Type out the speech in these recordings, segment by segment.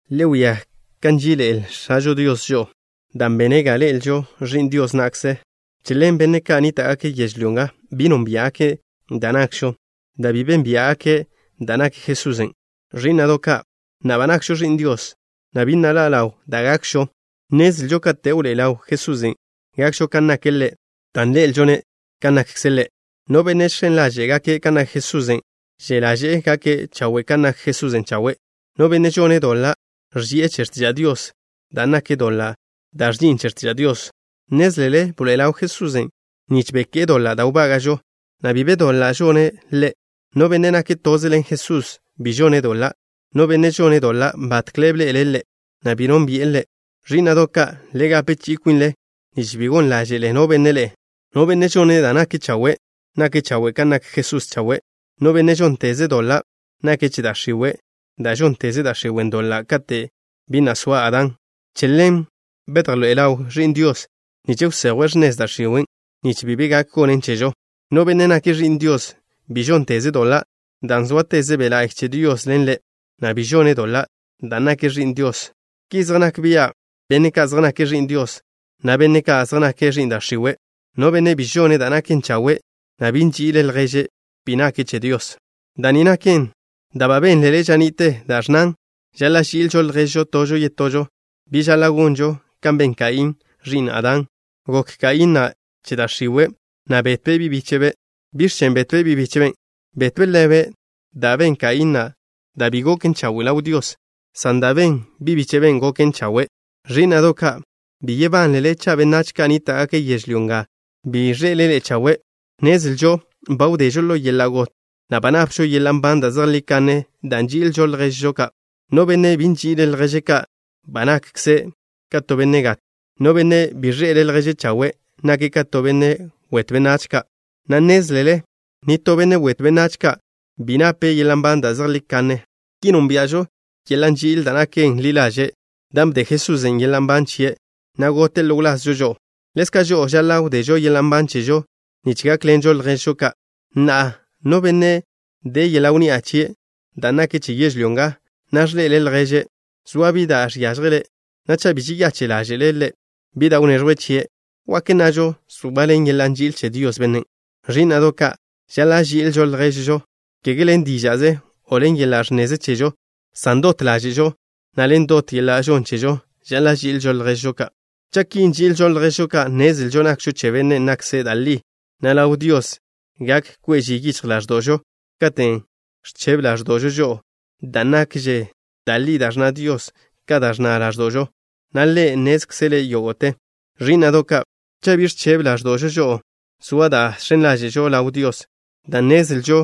Le wia kan nží'iḻe'el X̱ažo Dios žo'o, dan' bene' ga ležo ẕi'n Dios na'kze. Che ḻen benne' ka' nníta'gake' yežlyó nga bi nónbia'gake' da' nakžo, dan' bi beyónbia'gake' da' nak Jesusen'. Ẕí'na'do' ka', na'a ba nakžo ẕi'n Dios, na' bi na' ḻa' ḻaw da' gakžo. Nnezlžo kate' wḻoé'e ḻaw Jesusen', gakžo kan nake' Ḻe', dan' ḻe'elžo-ne' kan nakkze' Ḻe'. No benne' žx̱en ḻaže'e gake' kan nak Jesusen', že' ḻaže'e gake' chawe' kan nak Jesusen' chawe'. No benne' žone' doḻa' ẕži'e che x̱tiža' Dios, dan' nak doḻa' da' ẕži'in che x̱tiža' Dios. Nnézlele bḻoe'e ḻaw Jesusen' nich beké'e doḻa' da' wbága'žo, na' bi be doḻa' žone' Ḻe'. No benne' nake' toze ḻen Jesusen' bi žone' doḻa'. No benne' žone' doḻa' batkle bḻe'ele' Ḻe', na' bi nónbi'e Ḻe'. Ẕí'na'do' ka', le gape chi'i kwinle nich bi gon ḻáže'le no benne' ḻe'e. No benne' žone' da' naken chawe', nake' chawe' kan nak Jesusen' chawe'. No benne' žónteze' doḻa' nake' che da' x̱iwe', dan' žónteze da' x̱iwen' doḻa' kate' bi na' soa Adán. Che ḻen bedjḻoé'e ḻaw Ẕi'n Dios, nich wsejwe' x̱nez da' x̱iwen' nich bi be gak gonen chežo. No benne' nake' ẕi'n Dios bi žónteze' doḻa', dan' zóateze Be' La'y che Dios ḻen ḻe', na' bi žone' doḻa' dan' nake' ẕi'n Dios. Ki zej nak bia' benne' ka' zej nake' ẕi'n Dios, na' benne' ka' zej nake' ẕi'n da' x̱iwe'. No benne' bi žone' da' naken chawe', na' bi nži'ile' lježe', bi nake' che Dios. Da' ni naken da' ba benl-le ža ni'te, da' ẕnnan: “Žaḻa' ži'ilžo lježžo tožo yetožo.” Bi žaḻa' gonžo kan ben Kaín, ẕi'n Adán. Gok Kaín na' che da' x̱iwe', na' betbe' bi' bíche'be'. ¿Biẕ chen' betbe' bi' bíche'be'? Betbe' ḻebe' dan' ben Kaín na' da' bi goken chawe' ḻaw Dios, san da' ben bi' bíche'ben' goken chawe'. Ẕí'na'do' ka', bi yebánlele cha' benách ka' nníta'gake' yežlyó nga bi zej de ḻe'e chawe'. Nnezlžo ba wdežo ḻo yeḻa' got, na' ba napžo yeḻa' nban da' zejlí kanne dan' nži'ilžo lježžo ka'. No benne' bi nži'ile' lježe' ka', ba nakkze' ka to benne' gat. No benne' bi ẕḻe'ele' lježe' chawe', nake' ka to benne' wetw benách ka', na' nnézlele nitó benne' wetw benách ka' bi nape' yeḻa' nban da' zejlí kanne. Ki nónbia'žo yeḻa' nži'il da' naken ḻi ḻaže', dan' bde Jesusen' yeḻa' nban chie', na' gote' ḻo wlazžo žo'o. Ḻezka' žo'o žaḻa' wdežo yeḻa' nban chežo, nich gákḻenžo lježžo ka'. Na'a, no benne' de yeḻa' wnni'a chie', dan' naken che yežlyó nga, na' ẕḻe'ele' lježe', zoa bi da' žiážjele', na' cha' bi žeyache' ḻáže'le' ḻe', bi da' wneẕjwe' chie', ¿wak nnažo zoaḻen yeḻa' nži'il che Dios bennen'? Ẕí'na'do' ka', žaḻa' ži'ilžo lježžo ka', kege ḻen díža'ze o ḻo yeḻa' ẕnneze chežo, san dot ḻáže'žo, na' ḻen dot yeḻa' žon chežo žaḻa' ži'ilžo lježžo ka'. Cha' ki nži'ilžo lježžo ka', nnezlžo nakžo che Bennen' nakkze' da' li, na' ḻaw Dios gak kwe' ži yichj ḻáẕdo'žo katen' ẕchebe ḻáẕdo'žo žo'o, dan' nakže da' li da' ẕnna Dios ka da' ẕnna ḻáẕdo'žo, na' Ḻe' nnézkzele' yógo'te. Ẕí'na'do' ka', cha' bi ẕchebe ḻáẕdo'žo žo'o, zoa da' žx̱en ḻáže'žo ḻaw Dios, dan' nnezlžo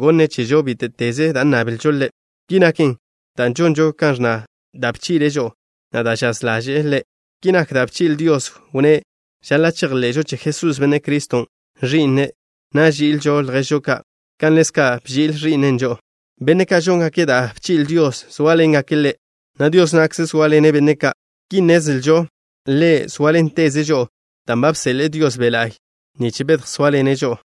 gonne' chežo bíte'teze da' nnablžo Ḻe'. Ki naken dan' žonžo kan ẕnna da' bchi'le' žo'o, na' da' žaz ḻaže'e Ḻe'. Ki nak da' bchi'le Dios, wnné' žaḻa' chejḻe'žo che Jesús, Benne' Criston', Ẕi'ne', na' ži'ilžo lježžo ka' kan ḻezka' bchi'le Ẕi'ne' žo'o. Benne' ka' žóngake' da' bchi'le Dios zóaḻengake' Ḻe', na' Dios na'kze zóaḻene' benne' ka'. Ki nnezlžo Ḻe' zóaḻenteze' žo'o, dan' ba bseḻe'e Dios Be' La'y nich bedjsóaḻene' žo'o.